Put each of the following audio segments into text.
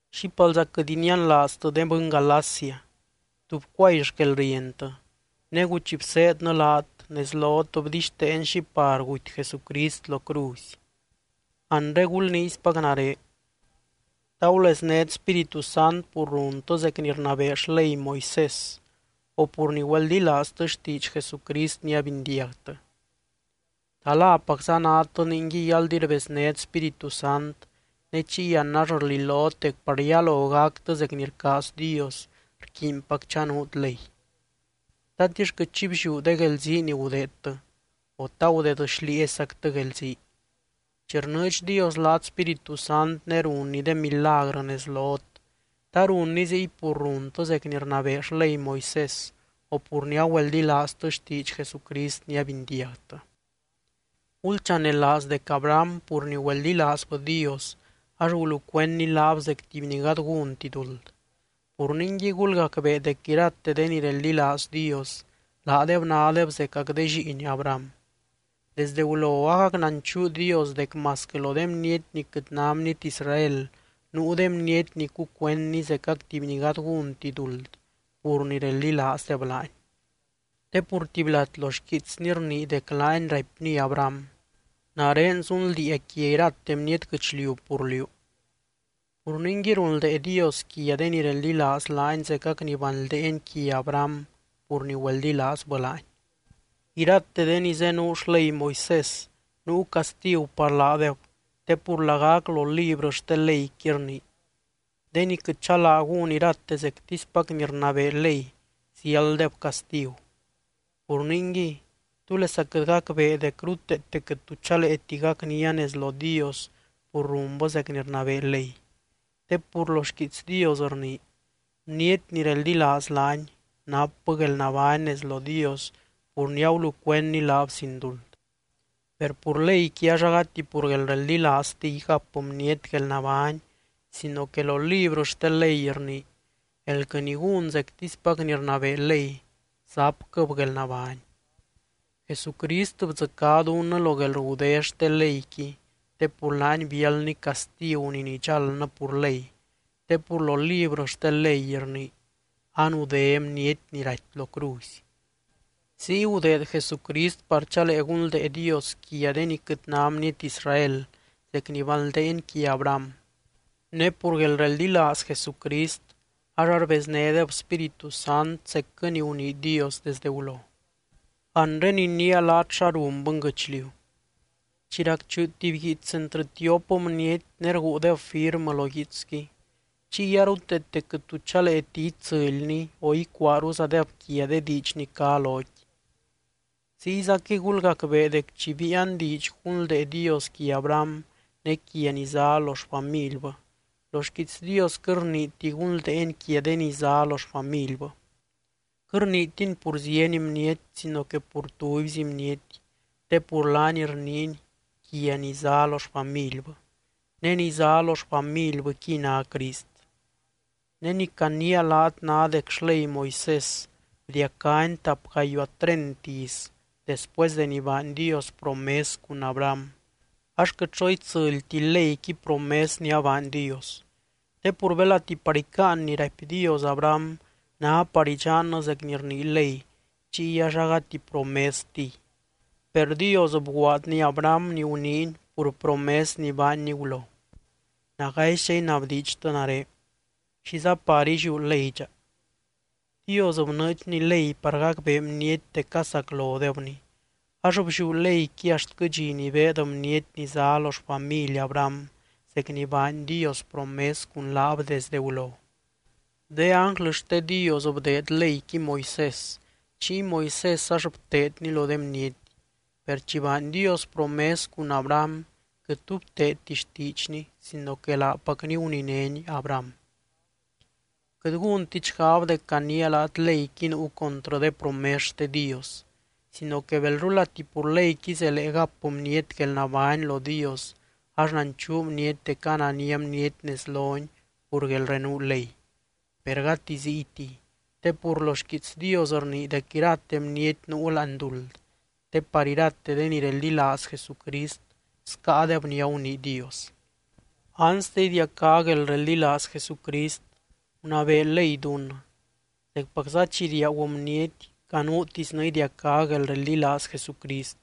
¡Xípalza quɨt inianlaaztɨ, de bɨny Galacia! ¿Tú bcuay xquelrientɨ? Negu chi bseednɨ laat, nez lot bdixteen xi par guty Jesucrist lo cruzy. Anre gulniispac nare: ¿Ta guleznét Spíritu Sant pur runtɨ zec ni rnabee xley Moisés, o pur ni güeldilaaztɨ xtiidx Jesucrist ni abindiagtɨ? ¿Ta lapacza nadtɨ ningui aldi rbeznét Spíritu Sant ne chiy an ax rlilot dec par yalo gactɨ zec ni rcaaz Dios rquiinpac chanuut ley? ¿Tatix quɨt xi blliú de guelzii ni gudeedtɨ, o ta gudeed xlieezyzactɨ guelzii? Chi rnɨɨdx Dios laat Spíritu Sant ne runny de milagrɨ nez lot, ¿ta runny ziy pur runtɨ zec ni rnabee xley Moisés o pur ni agüeldilaaztɨ xtiidx Jesucrist ni abindiagtɨ? Gulchanelaaz dec Abraham pur ni güeldilaazbɨ Dios ax gulucuendny laab zec tuby ni gady gúnti duld. Pur ningui gulgacbee dec irate de ni reldilaaz Dios, laadeb nádeb zecac de lliin Abraham. Desdɨ gulo agac nanchuu Dios dec masquɨ lo de bniety ni quɨt ná bniety Israel nuu de bniety ni cucuendny zecac tuby ni gady gúnti duld pur ni reldilaazdeb laany. Te pur tuby lat lo xquiitsny rnii dec laany raipny Abraham: “Nare zunldiia quia irate bniety guɨchliu pur liú.” Pur ningui, runldee Dios quia de ni reldilaaz laany zecac ni banldeeny quia Abraham pur ni güeldilaazbɨ laany. Irate de ni zenuu xley Moisés nuu castigu par laadeb te pur lagac lo librɨ xte leyqui rnii: “De ni quɨt chalaa gún irate zectispac ni rnabee ley, ziálddeb castigu.” Pur ningui, ¿túlesa quɨt gacbee dec ruteete quɨt tu chaleeti gacnia nez lo Dios pur runbɨ zec ni rnabee ley? Te pur lo xquiits Dios rnii: “Bniety ni reldilaaz laany, napbɨ guelnabány nez lo Dios pur ni agulucuendny laab sin duld.” Per pur leyqui ax agati pur guelreldilaaztiy gap bniety guelnabány sino que lo librɨ xte ley rnii: “Elquɨ ni gún zectispac ni rnabee ley, zapquɨ́b guelnabány.” Jesucrist bdzɨcá dunnɨ lo guelrgudé xte leyqui te pur laany biáldny castigu ni nidxaldnɨ pur ley (te pur lo librɨ xte ley rnii: “Anudé bniety ni raty lo cruzy”). Ziy gudeed Jesucrist par chalee gunldee Dios quia de ni quɨt ná bniety Israel, zec ni banldeeny quia Abraham. Ne pur guelreldilaaz Jesucrist ax arbeznédeb Spíritu Sant zecquɨ ni gunii Dios desdɨ gulo. Anre iniia laat xa run bɨnguɨchliu. Chi racchuu tuby guiits entrɨ tiop bniety ne rguudeb firmɨ lo guiitsqui, chiy aruteete quɨt tu chaleeti itsɨlni o icuaaruzadeb quia de diidx ni cá loqui. Ziyzaquɨy gulgacbee dec chi biian diidx gunldee Dios quia Abraham ne quia ni zá lo xfamilbɨ, lo xquiits Dios quɨt rniiti gunldeeny quia “de ni” zá lo xfamilbɨ. Quɨt rniitiny pur zieny bniety sino que pur tubyzi bniety, te pur laany rniiny quia “ni” zá lo xfamilbɨ. Ne ni zá lo xfamilbɨqui ná Crist. Ne ni caniia laat ná dec xley Moisés bdiacáni tap gayuaa treint iz después deni baany Dios promes cun Abraham, ax quɨt xo itsɨlti leyqui promes ni abaany Dios. Te pur belati par icáan ni raipy Dios Abraham ná par idxannɨ zec ni rnii ley, chiy ax agati promestiy. Per Dios bguaadny Abraham ni guniiny pur promes ni baanny gulo. Nagaizdxa inabdiidxtɨ nare: ¿Xiza par illiú ley dxa? Dios bnɨɨdxny ley par gacbee bniety dec casaclodebny, ax blliú leyqui axtquɨ dxi ni beed bniety ni zá lo xfamily Abraham zec ni baany Dios promes cun laab desdɨ gulo. De ánglɨ xte Dios bdeed leyqui Moisés, chiy Moisés ax bteedni lo de bniety. Per chi baany Dios promes cun Abraham quɨt tu bteedti xtiidxny sino que laapacny guninény Abraham. Quɨt gúntit xgab dec caniia laat leyqui nuu contrɨ de promes xte Dios. Sino que belrulati pur leyqui zelee gap bniety guelnabány lo Dios ax nanchuu bniety dec anania bniety nez lony pur guelrenuu ley. Per gati ziytiy te pur lo xquiits Dios rnii dec irate bniety nuu láani duld te par irate de ni reldilaaz Jesucrist scáadeb ni agunii Dios. Anste idiacá guelreldilaaz Jesucrist, gunabee ley dunnɨ. Zecpacza chi riaagu bniety canuutisnɨ idiacá guelreldilaaz Jesucrist.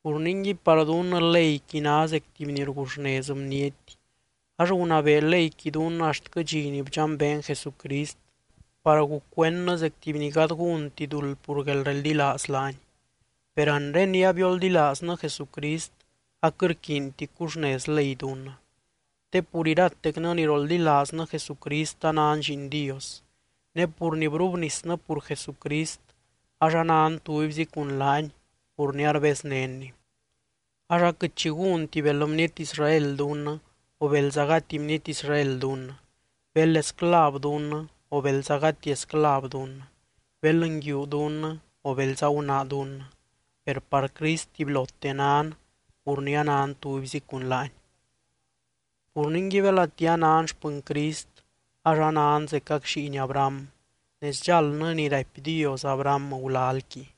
Pur ningui, par dunnɨ leyqui ná zec tuby ni rguxnez bniety ax gunabee leyqui dunnɨ axtquɨ dxi ni bdxambeen Jesucrist par gucuendnɨ zec tuby ni gady gúnti duld pur guelreldilaaz laany. Per anre ni abioldilaaznɨ Jesucrist aquɨt rquiinti cuxnez ley dunnɨ. Te pur iratecnɨ ni roldilaaznɨ Jesucrist anan lliin Dios. Ne pur ni brubnisnɨ pur Jesucrist ax anan tubyzi cun laany pur ni arbeznénny. Ax aquɨt xi gúnti bel bniety Israel dunnɨ o belza gati bniety Israel dunnɨ, bel esclav dunnɨ o belza gati esclav dunnɨ, bel nguiu dunnɨ o belza gunaa dunnɨ, per par Crist tubylote nan pur ni anan tubyzi cun laany. Pur ningui, belati anan xpɨny Crist ax anan zecac lliin Abraham ne sdxaldnɨ ni raipy Dios Abraham gulalqui.